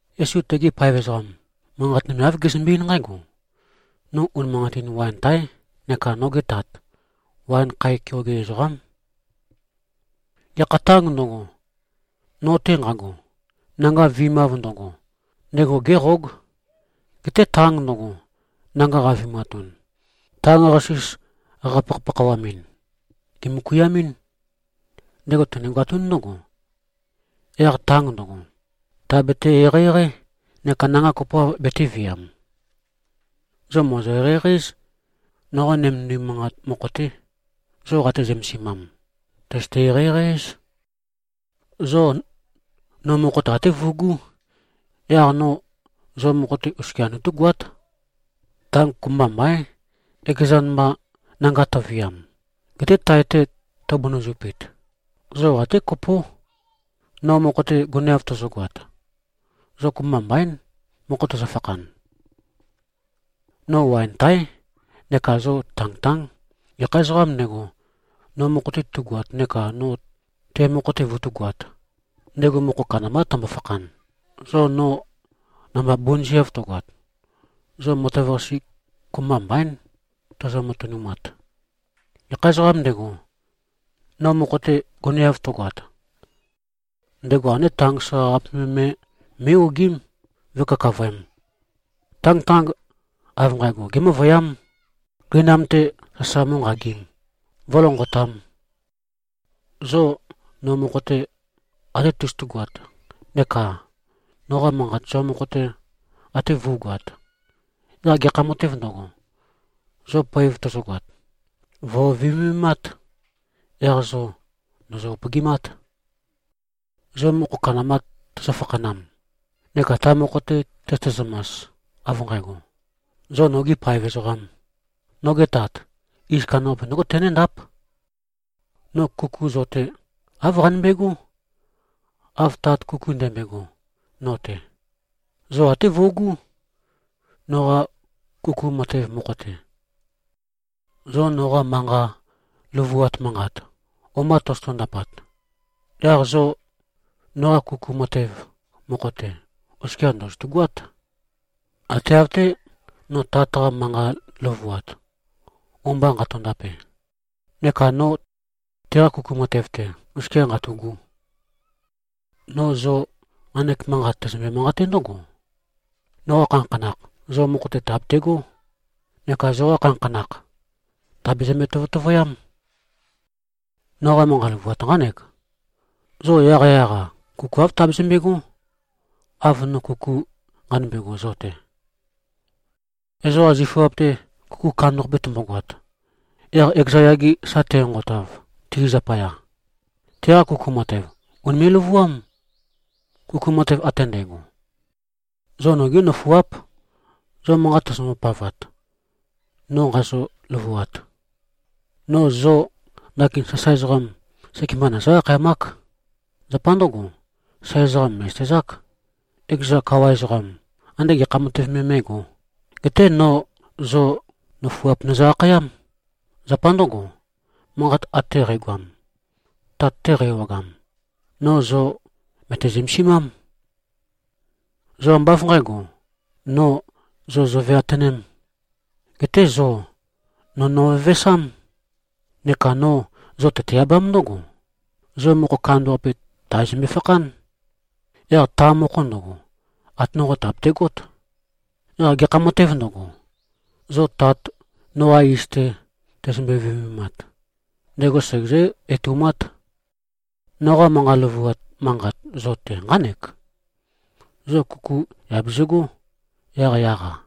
Yesu tegi paev ezoqam, manqat nøme, āv gezømbe-eín nqǽgo, “No unimanqatin waen táe, neka noge Tat, waen khae keoge ezoqám. Gekha tāng ndøgo, no-te nqago, nanga vi꞉mav ndøgo, ndego géqóg. Geté tang ndøgo, nanga qavi꞉matun, tang-qasis qapakhapakhawamɨn, gèmøkuiamɨ́n. Ndego tenegoatún ndǿgo, yaq tang ndøgo, tàbete-eqeieqeí neka nanga kopoav betēviam. Zo mòzo-eqeieqei-éz. Noqa nømendim manqat mokho-té, zo qate-zømesimam, tøzøte-eqeieqei-éz. Zo no mokho-te até vøugú, yaq no zo mokho-te oskia nøtúgoát. Tang kopømba mbaín, ekezan mba nanga tøviam, geté tae-te tøbunøzupit. Zo até kopó. No mokho-te goneav tozogoat, zo kopømba mbaín, mokho tøzøfakhan. No waen taé, neka zo tangtáng. Gekha ezoqām ndego, no mokho-te tu꞉goat neka no te mokho-te vøtúgoāt, ndego mokho kandambá tømbo-fakhan. Zo no namba bunøzeav tøgoat, zo matev-qase kopømba mbaín, tozo-matønumat. Gekha ezoqām ndego, no mokho-te goneav tøgoat, ndego ande tang soqaqape me mé꞉-ogím, vǿkakavøēm. Tangtang av nqægo gémøvøyám, gøinam-te sasa mǿnqagīm, vǿlønqotām. Zo no mokho-te ate tozotugoat neka noqa manqat zo mokho-te ate vǿugoāt, yaq gekha matēv ndøgo, zo poev tøzøgoat, vø̀viømemát, yaq zo ndòzo-upøgimát. Zo mokho kandamba tøzø-fakhanam neka ta mokho-te tøzøte-zømas, av nqægo, zo nogī paev ezoqām, noge Tat iz kandambaqape ndǿgo tenéndáp. No kuku zo-te, āv qanømbegó, av Tat kuku ndømbøego no-te. Zo até vøugú, noqa kuku matev mokho-te. Zo noqa manqa løvuat manqat, o-mba tozoto-ndapat, yaq zo noqa kuku matev mokho-te oskia ndòzotu꞉-goát, ate av-té, no Tat-qa manqa løvuat, o-mba nqato-ndape, neka no teqa kuku matev-te oskia nqatu꞉gu. No zo nqanek manqat, tæzømbe-manqaté ndǿgo: Noqa khanakhanakh zo mokho-te tàbetegó neka zoqa khanakhanakh tàbezømbe-tøtøvøyám. Noqa manqa løvuat nqánek: Zo yaqyaq-a kuku āv tabezømbe꞉gó, av no kuku nqanømbe꞉go zo-te. Ezoqa zifuap-te kuku kandambaqape tømbogoat, yaq ekeza yage sa tenqonqotav, ti zapaya, teqa kuku matev, ùnime꞉-løvuám, kuku matev ate ndægo. Zo nogí nøfuáp, zo manqat tozombo-pavat, no nqazø-løvuat. No zo ndakin sasae ezoqam, sekemba nøzǿ-akhayamák. Zapa ndǿgo, sasae ezoqam mè꞉zøtezák, ekeza kawa ezoqam, ande gekha matev me mé꞉gō. Geté no zo nøfuap nøzø-akhayám. Zapa ndǿgo, manqat ate qægoam, Tat-te qæ-ewagam, no zo mø̀te-zømesimám. Zo ambá av nqǣgo, no zo zoveatønēm. Geté zo no nøvevesám. Neka no zo tøte-abám ndǿgo, zo mokho kandambaqape tàbezømbe-fakhán. Yaq ta mokho ndøgo, ate nonqo tàbetegót. Yaq gekha matēv ndøgo, zo Tat noqa iz-te tozombo-viømemat, ndego segezǿ-etoumát. Noqa manqa løvuat manqat zo-te nqánek: Zo kuku yà bezøgó, yaqyaq-a.”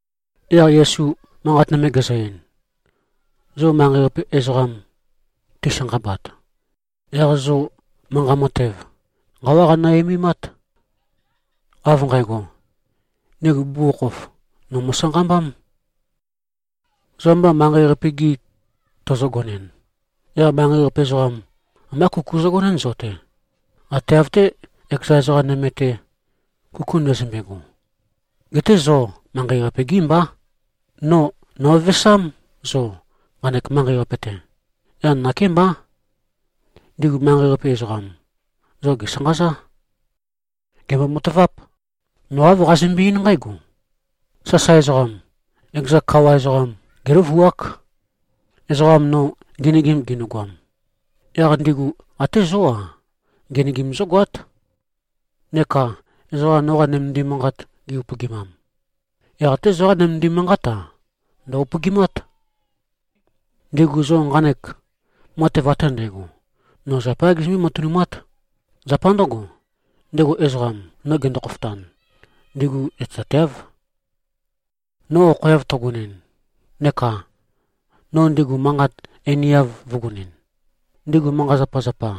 Yaq Yesu manqat nøme gezø-ein, “Zo manqei-qape ezoqam tisanqabat, yaq zo manqa matev nqawá qanø-eimimát, av nqægo, ndigu bugukhokhof no mo꞉sanqambám. Zo amba manqei-qape-gi tozogonɨn, yaq manqei-qape ezoqam, ambá kuku zøgonɨ́n zo-te, ate av-té, ekeza ezoqa nøme-te, kuku ndøzømbe꞉go. Geté zo manqei-qape-gí mbá. No nø̀vevesám zo, nqanek manqei-qape-te. Yaq nakémbá, ndigu manqei-qape ezoqam, zo gèsanqazá. Gèmbo-mataváp. No āv qazømbe-eín nqǽgo, ‘Sasae ezoqam, ekeza kawa ezoqam géløvuák.’ Ezoqa no ngenøgim ginøgoam, yaq ndigu até zó-a, ngenøgim zǿgoát. Neka ezoqa, noqa nømendim manqat gi-upøgimam, yaq até zoqá nømendim manqát-a, ndø̀-upøgimát. Ndigu zo nqanek matev ate ndægo, no zapayá gizømbé-matønumát. Zapa ndǿgo, ndego ezoqam, no gendo-khofotan, ndigu zøtezateáv. No okhoeav tøgonɨn neka no ndigu manqat einiav vø̄gonɨn, ndigu manqa-zapazapa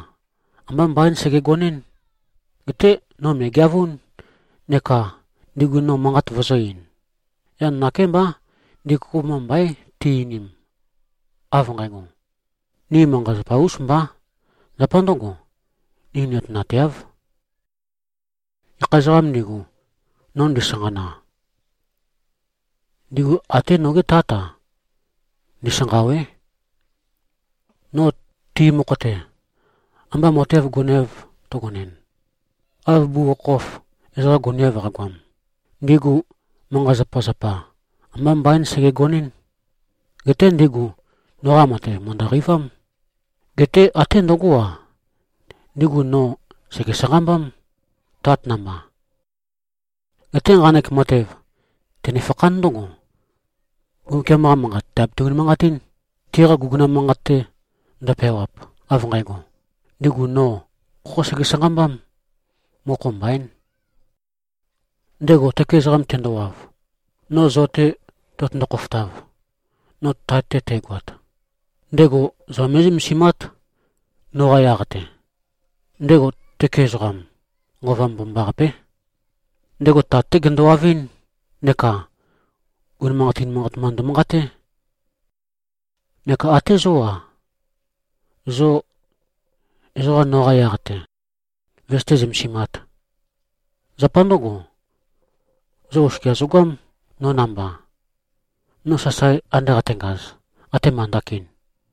ambá mbaín sègegonɨ́n. Geté no mø̀egeavún neka no ndigu manqat vøzø̄-ein. Yaq nakémbá, ndigu kopømba mbaín ti-einim, av nqægo, ‘Ni manqa-zapa-ūs mbā, zapa ndø̄go, ni nøtenateāv.’ Gekha ezoqām ndigu, no ndisanqana, ndigu até nogé Tát-a, ndisanqâwé. No ti mokho-te amba matev goneav tøgonɨn, av bugukhokhof ezoqa goneav qagoam, ndigu manqa-zapazapa ambá mbaín sègegonɨ́n. Geté ndigu noqa matev mø̀ndø-qeivám. Geté até ndøgó-a, ndigu no sège-sanqambám, Tat namba. Geté nqanek matev tønefakhán ndǿgo, Mbumbukiam-qa Manqat tàbete-unimanqatín, tiqa guguna manqat-te ndøpeawap, av nqægo, ‘Ndigu no khokhó sege-sanqambám. Mokho mbaín.’ Ndego tøke ezoqam tendowav, no zo-te tøtøndo-khofotav, no Tat-te tægoat, ndego zo mé꞉zømesimát, noqa yaq-te. Ndego tøke ezoqam, Nqova Mbomambaqapé. Ndego Tat-té gendowavɨ́n neka unimanqatin manqat mba ndømanqaté. Neka ate zó-a, zo ezoqa noqa yaq-te vøzøté-zømesimāt. Zapa ndǿgo, zo oskia zogoám no namba, no sasae ande qatengaz, atema ndakin.”